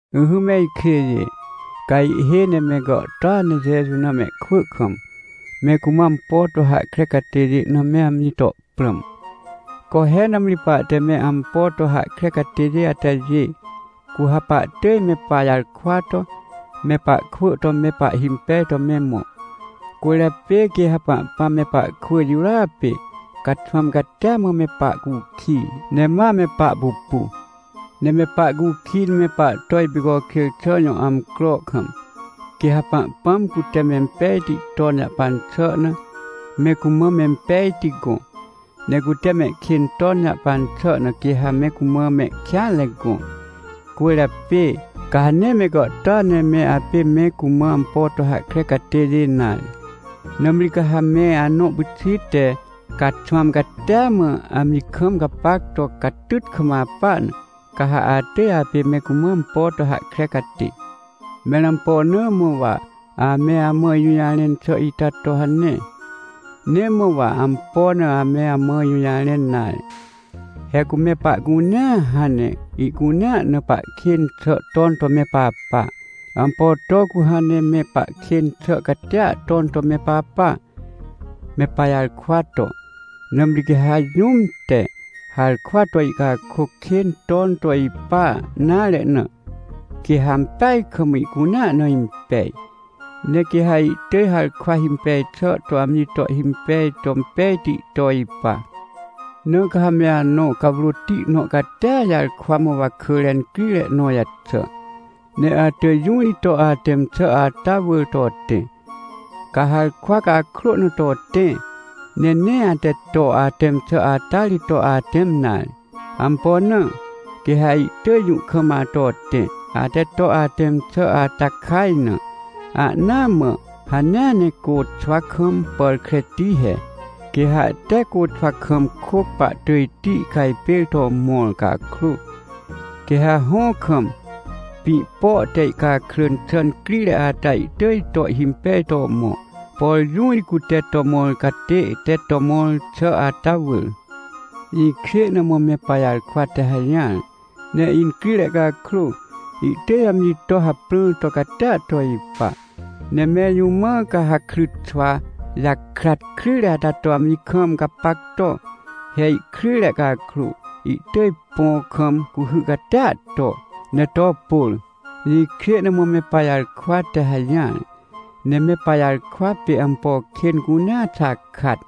Ỹhỹ me ikjêjê, ca ihhêj ne me gàhtôa ne Jeju na mehkwỳ kam, me cumã ampo to hahkre catêjê na me amji to prãm. Co he, nãmri pahte me ampo to hahkre catêjê atajê, cu ha pahtỳj me pajarkwa to me pahkwỳ to me pahhimpej to me mõ. Cwỳrjapê quê ha Pahpãm me pahkwỳ jirôa pê, caxwãm catia mã me pahcukij, ne ma me pahpupu. Ne me pahcukij ne me pahto ipicokjêr xà jõ amcro kam, quê ha Pahpãm cute mempejti ton jahpan xà na me cumã mempejti gõ, ne cute mehkên ton jahpan xà na quê ha me cumã mehkêanre gõ. Cwỳrjapê, ca ha nee me gàhtôa ne me apê me cumã ampo to hahkre catêjê nare, nãmri ca ha me anõ pyxit te caxwãm catia mã, amji kam gapac to catyt kam apa na, ca ha atỳj apê me cumã ampo to hahkre catê. Mẽr ampo na mã wa ame amã ijũjarẽn xà ita to hane? Nee mã wa ampo na ame amã ijũjarẽn nare. He cu me pahcunea hãn ne ihcunea na pahkên xà ton to me papa. Ampo to cu hãn ne me pahkên xà catia ton to me papa? Me pajarkwa to! Nãmri quê ha jũm te harkwa to ihcakôc kên ton to ipa nare na, quê ha ampeaj kam ihcunea na impej. Ne quê ha ihtỳj harkwa himpej xà to amji to ihhimpej to impejti to ipa. Na ca ha me anõ cawrôti nõ catia jarkwa mã wakỳre incrire nõ jaxà, ne atỳj jũ ri to atẽm xà ata wỳr to tẽ. Ca harkwa cakrô na to tẽ, ne nee ate to atẽm xà ata ri to atẽm nare. Ampo na? Quê ha ihtỳj jũ kam ato tẽ, ate to atẽm xà ata kaj na. Ahnaa mã hanea ne côxwa kam pàr kreti he. Quê ha tee côxwa kam kôc pahtỳjti ihcajpêr to mõr cakrô, quê ha hõ kam, pĩ po te ihcakrỳn xà incrire ata ihtỳj to ihhimpej to mõ, por jũ ri cute to mõr catê te to mõr xà ata wỳr. Jĩkjê na mã me pajarkwa te hajỹar. Ne incrire cakrô, ihtỳj amji to hàprãr to catia to ipa. Ne mẽr jũ mã ca ha krytxwa jakrat kryjre ata to amji kam gapac to? He ihkryjre cakrô, ihtỳj põ kam cuhy catia to ne to pôr. Jĩkjê na mã me pajarkwa te hajỹar. Ne me pajarkwa pê ampo kên cunea xakat.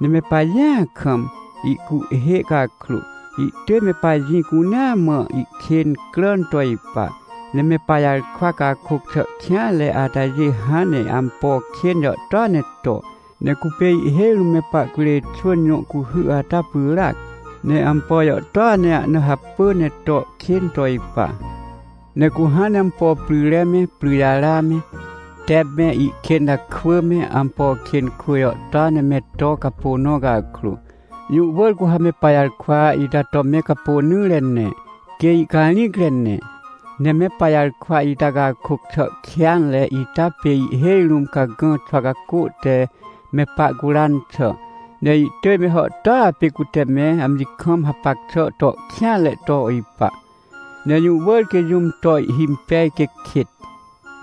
Ne me pajĩa kam ihcuhhê cakrô, ihtỳj me pajĩ cunea mã ihkên cràn to ipa. Ne me pajarkwa cakôc xà kêanre atajê hãn ne ampo kên jàhtôa ne to. Ne cupê ihhêj rũm me pahcurê xwỳn jõ cuhy ata pyràac, ne ampo jàhtôa ne ahna hapỳ ne to kên to ipa. Ne cu hãn ne ampo pryre me, pryjara me, tep me, ihkênta kwỳ me, ampo kên kwỳ jàhtôa ne me to capô nõ cakrô, jũ wỳr cu ha me pajarkwa ita to me capônỹre ne, quê ihcarĩcre ne. Ne me pajarkwa ita cakôc xà kêanre ita pê ihhêj rũm cagã xwa cacô te me pahcuran xà, ne ihtỳj me hàhtôa pê cute me amji kam hapac xà to kêanre to ipa. Ne jũ wỳr quê jũm to ihhimpej quê kêt.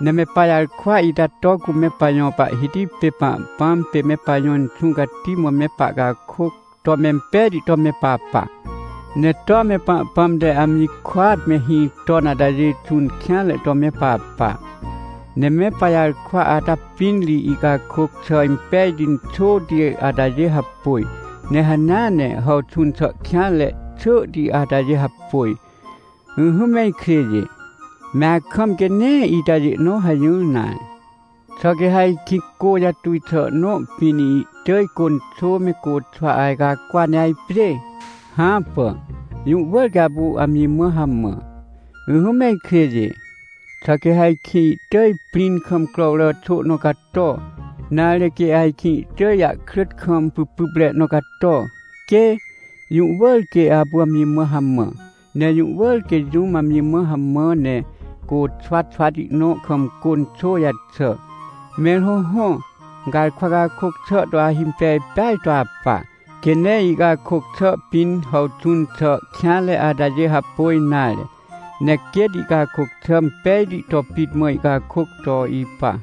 Ne me pajarkwa ita to cu me pajõ Pahhiti pê Pahpãm pê me pajõ Inxũ Cati mã me pahcakôc to mempejti to me papa. Ne toa me Pahpãm te amji kôat mehĩ ton atajê xũn kêanre to me papa. Ne me pajarkwa ata pĩn ri ihcakôc xà impejti inxôti atajê hapôj, ne hanea ne hàwxũn xà kêanre xỳhti atajê hapôj. Ỹhỹ me ikjêjê, me akam quê nee itajê nõ hajỹr nare. Xà quê ha ajkĩ cô jatuj xà nõ pĩn ihtỳj cô inxô me côxwa ajcacwa ne ajpjê? Hãpà, jũ wỳr quê apu amji mã hamã. Ỹhỹ me ikjêjê, xà quê ha ajkĩ ihtỳj prĩn kam crowrà xô nõ cato? Nare, quê ajkĩ ihtỳj ahkrỳt kam pypypre nõ cato? Quê! Jũ wỳr quê apu amji mã hamã. Ne jũ wỳr quê jũm amji mã hamã ne côxwa xwati nõ kam cô inxô jaxà. Mẽr hõhõ, garkwa cakôc xà to ahimpej pêa to apa, quê nee ihcakôc xà pĩn hàwxũn xà kêanre atajê hapôj nare, ne quêt ihcakôc xà impejti to pit mã ihcakôc to ipa.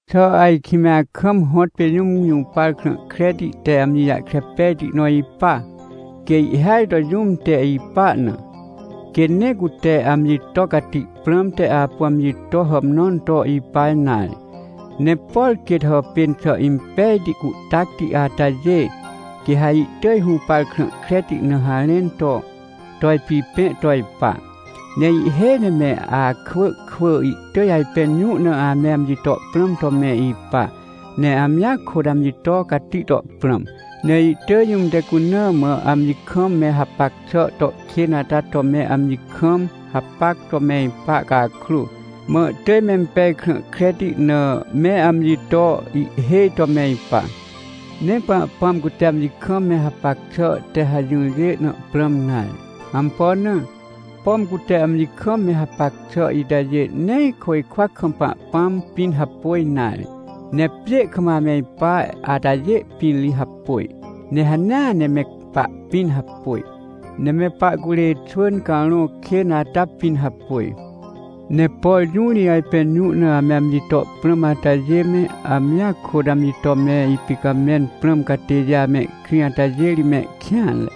Xà ajkĩ me akam hõtpê jũm jũpar krã kreti te amji jahkre pejti nõ ipa? Quê ihhêaj to jũm te ipa na, quê nee cute amji to cati prãmte apu amji to hàmnãn to ipa nare. Ne por quêt hàpên xà impejti, cuhtacti atajê, quê ha ihtỳj hũpar krã kreti na harẽn to, to ipipẽ to ipa. Ne ihhêj ne me akwỳ kwỳ ihtỳj ajpẽn jũ na ame amji to prãm to me ipa, ne amjia kôt amji to cati to prãm, ne ihtỳj jũm te cuna mã amji kam me hapac xà to kên ata to me amji kam hapac to me ipa cakrô, mã ihtỳj mempej krã kreti na me amji to ihhêj to me ipa. Nee Pahpãm cute amji kam me hapac xà te hajỹrjê na prãm nare. Ampo na? Pom cute amji kam me hapac xà itajê nee côjkwa kam Pahpãm pĩn hapôj nare, ne pjê kam ame ipa atajê pĩn ri hapôj, ne hanea ne me pahpĩn hapôj. Ne me pahcurê xwỳn carõ kên ata pĩn hapôj. Ne por jũ ri ajpẽn jũ na ame amji to prãm atajê me, amjia kôt amji to me ipicamẽn prãm catêjê amehkrĩ atajê ri mehkêanre,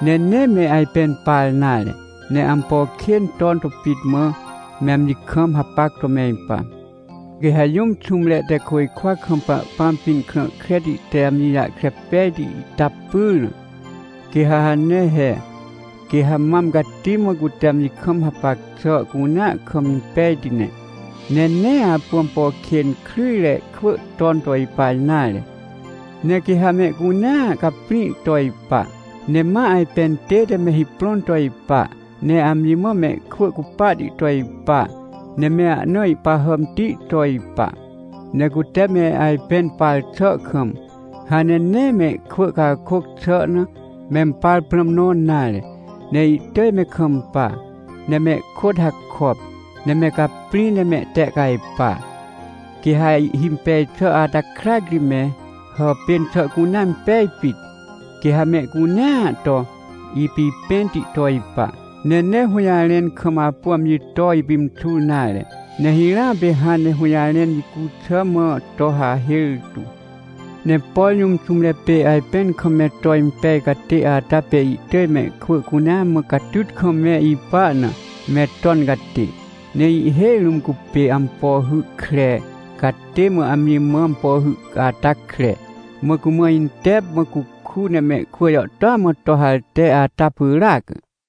ne nee me ajpẽn par nare, ne ampo kên ton to pit mã, me amji kam hapac to me ipa. Quê ha jũm xũmre te côjkwa kam Pahpãm pĩn krã kreti te amji jahkre pejti ita pyr na, quê ha hane he. Quê ha mam cati mã cute amji kam hapac xà cunea kam impejti ne, ne nee apu ampo kên kryjre kwỳ ton to ipa nare. Ne quê ha mehcunea caprĩ to ipa, ne ma ajpẽn tête me hiprõn to ipa, ne amji mã mehkwỳ cupahti to ipa, ne me ahna ihpahàmti to ipa. Ne cute me ajpẽn par xà kam, hãn ne nee mehkwỳ cakôc xà na, mempar prãm nõ nare, ne ihtỳj me kampa, ne mehkôt hakop, ne me caprĩ ne mehtehcajpa. Quê ha ihhimpej xà ata krac ri me hàpên xà cunea impej pit. Quê ha mehcunea to ipipẽnti to ipa. Ne nee hũjarẽn kam apu amji to ipimxur nare, ne hirãa pê hãn ne hũjarẽn jicu xà mã to hahêr tu. Ne por jũm xũmre pê ajpẽn kam me to impej catê ata pê ihtỳj mehkwỳ cunea mã catyt kam me ipa na, me ton catê. Ne ihhêj rũm cupê ampo hy kre catê mã amji mã ampo hy ata kre, mã cumã intep, mã cuku ne mehkwỳ jàhtôa mã to harte ata pyràac.